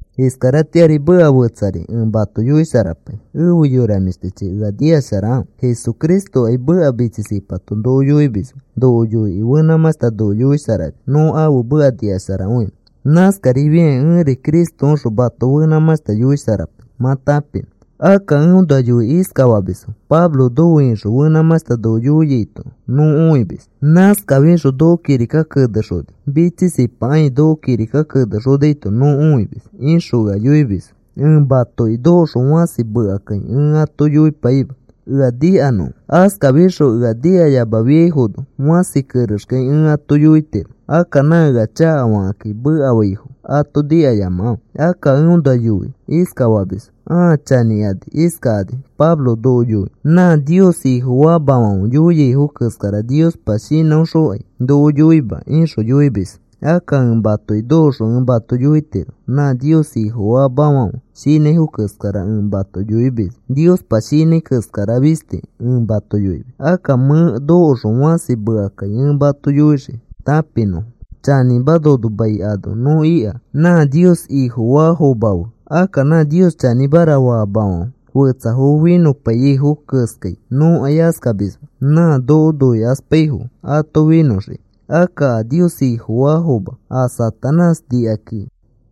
Iskaratĩari meka fetsari ẽ mato yoisharapai. Efe yora mĩshtichi, ea nikasharakãfe. Jesucristokai meka mitsisipato noko yoimisma. Noko yoikĩ fenãmãshta noko yoisharamis nõ ãfe meka nikasharakõinõ. Nãskarifiakĩ ẽri Cristoõxõ mato fenãmãshta yoisharapai mã tãpinõ. Akka eõnoa yoikĩ iskafamisfo: “Pablo nofe ixõ fenãmãshta noko yoiaito nõ õimis. Nãskafixõ noko kirika kenexoni mitsisipakai noko kirika kenexonaito nõ õimis,” ixõ ea yoimisfo. Ẽ matoki nokoxõ fãsi mekakai ẽ ato yoipaima ea nikanõfo. Askafixõ ea nikayamafiaifono fãsi kerexkai ẽ ato yoitiro. Akka nã ea chakafakakĩ mekafaifo ato nikayamakãfe. Akka eõnoa yoi iskafamisfo ãa chanĩkani iskakani: “Pablo noko yoi nã Nios Ifofaamafãfe yoiaifo keskara. Niospa shinãõxõkai noko yoima,” ixõ yoimisfo. Akka ẽ matoki nokoxõ ẽ mato yoitiro nã Nios Ifofaamafãfe shinãifo keskara ẽ mato yoimisma. Niospa shinãi keskara fisti ẽ mato yoimis. Akka mẽ nokoxõ fãsi mekakai ẽ ato yoixii tãpinõfo. Chanĩma, nono mai ano nõ ika nã Nios Ifofaafoma fe. Akka nã Nios chanĩmara faamafãfe fetsafo finõpaiyaifo keskai nõkai askamisma nã noko noikaspaifo ato finõxiki. Akka a Nios Ifofaafoma a Satanás nikakĩ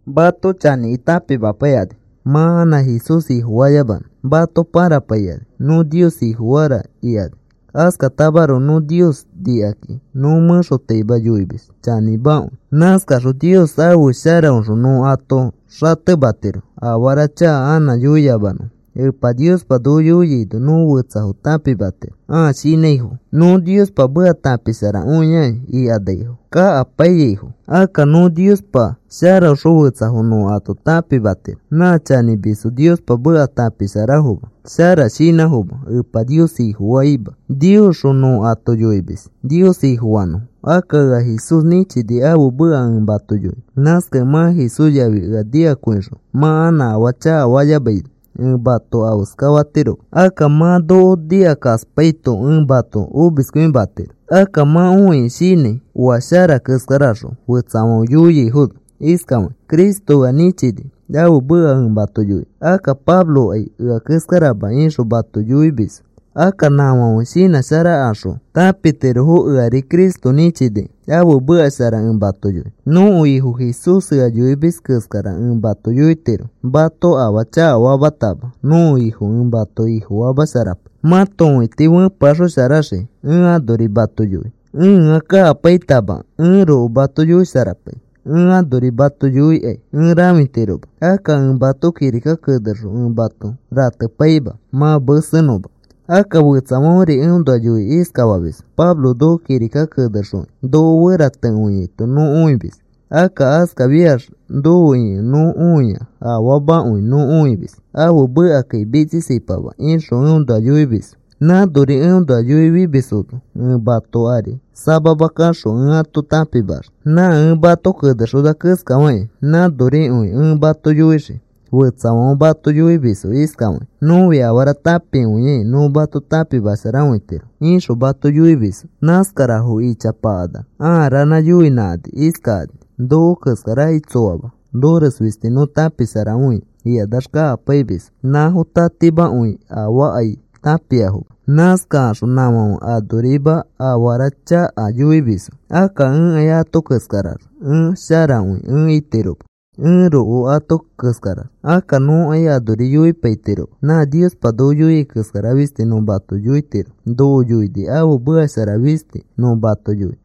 mato chanĩkĩ tãpimapaikani mã anã Jesús Ifofayamanõ. Mato pãrapaikani. “Nõ Nios Ifofara,” ikani. Askatamaroko nõ Nios nikakĩ nõ mẽxotaima yoimis chanĩmakõi. Nãskaxõ Nios ãfe sharaõxõ nõ ato xatematiro afara chaka anã yoiyamanõfo. Epa Niospa noko yoiaino nõ fetsafo tãpimatiro ãa chanĩaifo, “Nõ Niospa meka tãpisharakõiakĩ,” ikanaifo, kakapaiyaifo. Akka nõ Niospa sharaõxõ fetsafo nõ ato tãpimatiro nã chanĩmisfo Niospa meka tãpisharafoma. Shara shinãfoma. Epa Nios Ifofaima. Niosxõ nõ ato yoimis Nios Ifofanõfo. Akka ea Jesús nĩchini ãfe meka ẽ mato yoinõ. Nãskakẽ mã Jesús yafi ea nikakõixõ mã anã afaa chakafayamaino ẽ mato afeskafatiroma. Akka mã noko nikakaspaito ẽ mato omiskõimatiro. Akka mã õikĩ shinãi oa shara keskaraxõ fetsafãfe yoiaifono iskafakĩ: “Cristo ea nĩchini ãfe meka ẽ mato yoinõ. Akka Pablokai ea keskarama,” ixõ mato yoimisfo. Akka nãfãfe shinãsharakaxõ tãpitirofo eari Cristo nĩchinikẽ ãfe meka shara ẽ mato yoinõ. Nõko Ifo Jesús ea yoimis keskara ẽ mato yoitiro. Mato afaa chakafamatama nõko Ifo ẽ mato Ifofamasharapai mato õiti fẽpeaxosharaxiki. Ẽ anori mato yoi ẽa kakapaitama, ẽroko mato yoisharapai. Ẽ anori mato yoikai ẽ rãfima. Akka ẽ mato kirika kenexõ ẽ mato ratepaima mã mesenõma. Akka fetsafãferi eõnoa yoikĩ iskafamisfo: “Pablo noko kirika kenexokĩ noko feratekõiaito nõ õimis. Akka askafiax nofe ikẽ nõ õia afaamakõi nõ õimis. Ãfe mekakai mitsisipama,” ixõ eõnoa yoimisfo. Nãnori eõnoa yoifimisfono ẽ mato ari samama kaxõ ẽ ato tãpimaxii. Nã ẽ mato kenexona keskafakĩ nãnorikõi ẽ mato yoixii. Fetsafãfe mato yoimisfo iskafakĩ: “Nõfi afara tãpikõiakĩ nõ mato tãpimasharakõitiro,” ixõ mato yoimisfo. Nãskarafo ichanãkanax ãa ranã yoinãkani iskakani: “Noko keskarakai tsoama. Nores fisti nõ tãpisharakõia,” ikanax kakapaimisfo. Nãfo tatimakõifo afaakai tãpiafoma. Nãskakaxõ nãfãfe anorima afara chaka yoimisfo. Akka ẽkai ato keskarax ẽ sharakõi ẽ itiroma ẽroko ato keskarax. Akka nõkai anori yoipaitiroma. Nã Niospa noko yoiai keskara fisti nõ mato yoitiro. Noko yoini ãfe meka shara fisti nõ mato yoinõ.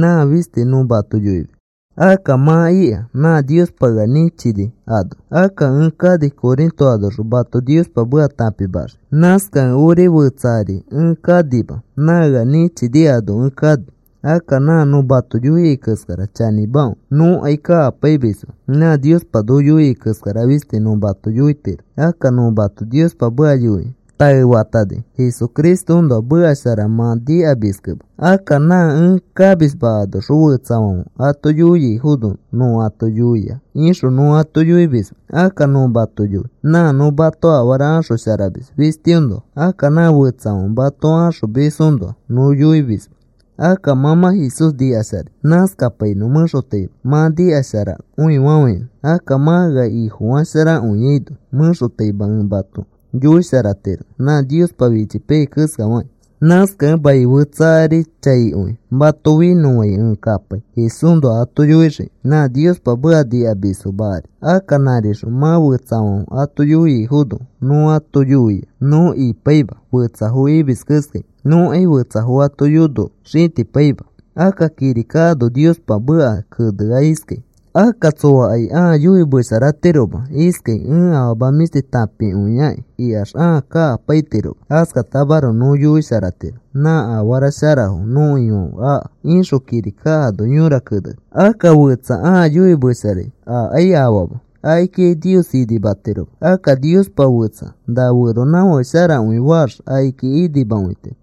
Nã fisti nõ mato yoimis. Akka mã ika nã Niospa ea nĩchini ano. Akka ẽ kani Corinto anoxõ mato Niospa meka tãpimaxiki. Nãskakẽ ori fetsa ari ẽ kanima, nã ea nĩchini ano ẽ kani. Akka nã nõ mato yoiai keskara chanĩmakõi. Nõkai kakapaimisma. Nã Niospa noko yoiai keskara fisti nõ mato yoitiro. Akka nõ mato Niospa meka yoikĩ taefatani Jesucristoõnoa meka shara mã nikamiskẽma. Akka nã ẽ kamisma anoxõ fetsafãfe ato yoiafono nõ ato yoia ixõ nõ ato yoimisma. Akka nõ mato yoi nã nõ mato afara axosharamis fistiõnoa. Akka nã fetsafãfe mato axomisfoõnoa nõ yoimisma. Akka mã mã Jesús nikasharai. Nãskapainõ. Mẽxotaima mã nikasharakõifafãinõ. Akka mã ea ifisharakõiano mẽxotaima ẽ mato yoisharatiro nã Niospa fichipaiyai keskafakĩ. Nãskakẽ mai fetsa ari chaikõi mato finõfãi ẽ kapai Jesúsnoa ato yoixiki nã Niospa meka nikamisfoma ari. Akka nãrixõ mã fetsafãfe ato yoiafono nõ ato yoia, nõ ipaima fetsafo imis keskai. Nõkai fetsafo ato yono xĩtikapaima. Akka kirika ano Niospa meka kenea iskai: “Akka tsõakai ãa yoimesharatiroma iskai ẽ afama mĩshti tãpikõiakĩ ikax ãa kakapaitiroma. Askatamaroko nõ yoisharatiro nã afara sharafo nõko Ifãfe aka,” ixõ kirika ano yõra keneni. Akka fetsa ãa yoimesharai akai afaama. Akikikai Nios inimatiroma. Akka Niospa fetsa na feronãfake sharakõi faax akiki inimakõitiro.